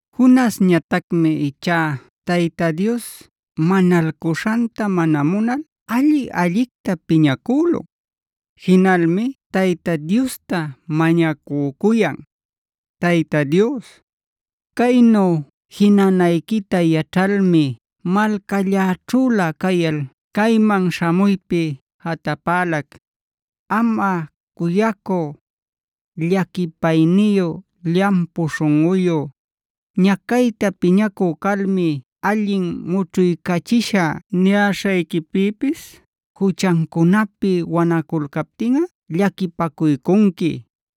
Jonasñatacmi ichá Tayta Dios manalcuśhanta mana munal alli-allicta piñacülun. Jinalmi Tayta Diosta mañacücuyan: “Tayta Dios, caynu jinanayquita yaćhalmi malcalläćhülä cayal cayman śhamuypi jatapälac. Amꞌa cuyacü, llaquipayniyu, llampu śhunꞌuyu, ñacayta piñacü calmi ‘allin mućhuycachishä’ niyäśhayquipïpis juchancunapi wanaculcaptinꞌa llaquipaycunqui.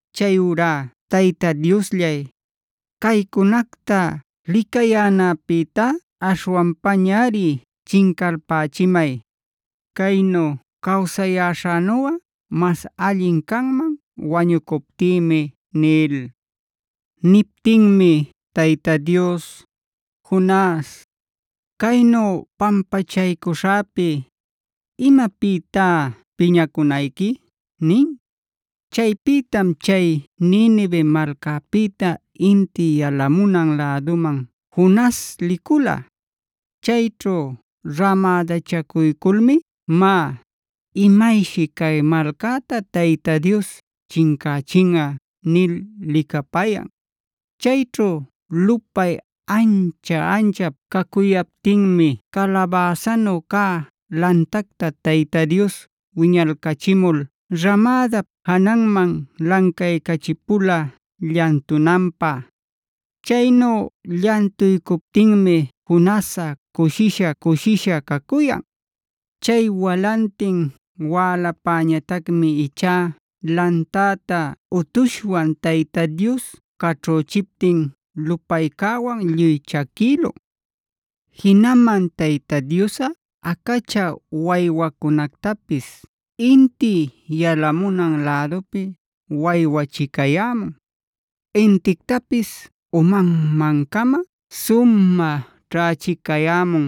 Chayurá Tayta Diosllay, caycunacta licayänäpïtá aśhwanpañari chincalpächimay. Caynu cawsayäśhänuꞌa mas allin canman wañucuptïmi” nil. Niptinmi Tayta Dios: “Jonas, ¿caynu pampachaycuśhäpi, imapïtá piñacunayqui?” nin. Chaypïtam chay Ninive malcäpïta inti yalamunan läduman Jonas licula. Chayćhu ramädachacuyculmi: “Má, imayshi cay malcäta Tayta Dios chincächinꞌa” nil licapayan. Chayćhu lupay ancha-anchap cacuyaptinmi calabäsanu cä lantacta Tayta Dios wiñalcachimul ramädap jananman lancaycachipula llantunanpä. Chaynu llantuycuptinmi Jonasꞌa cushisha-cushisha cacuyan. Chay walantin wälapäñatacmi ichá lantäta utushwan Tayta Dios caćhüchiptin lupaycäwan lluy chaquïlun. Jinaman Tayta Diosꞌa acachä waywacunactapis inti yalamunan lädupi waywachicayämun, intictapis umanman-cama sumä ćhächicayämun.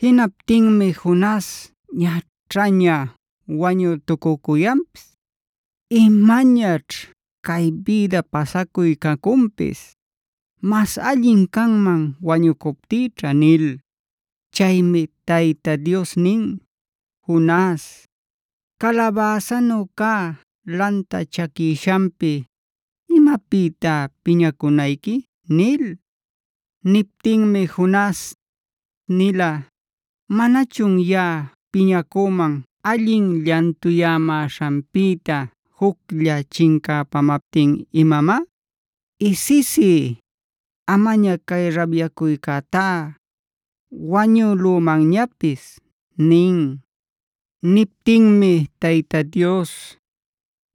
Jinaptinmi Jonas ñaćhaña wañütucücuyanpis: “¡Imañaćh cay bïda pasacuy cacunpis! ¡Mas allin canman wañucuptïćha!” nil. Chaymi Tayta Dios nin: “Jonas, ¿calabäsanu cä lanta chaquishanpi, imapïtá piñacunayqui?” nil. Niptinmi Jonas nin: “Nila ¿manachun yaꞌa piñacüman, allin llantuyämäśhanpïta juclla chincäpamaptin imamá? Isisí, amaña cay rabyacuycätá, wañülümanñapis” nil. Niptinmi Tayta Dios: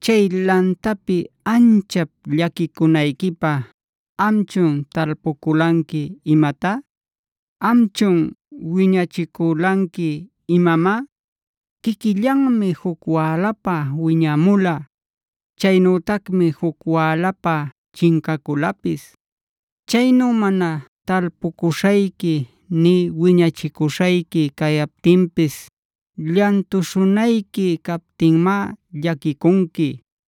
“Chay lantapi anchap llaquicunayquipä ¿amchun talpuculanqui imatá? ¿Amchun wiñachiculanqui imamá? Quiquillanmi juc wälapä wiñämula. Chaynütacmi juc wälapä chincaculapis. Chaynu mana talpucuśhayqui nï wiñachicuśhayqui cayaptinpis llantuśhunayqui captinmá llaquicunqui.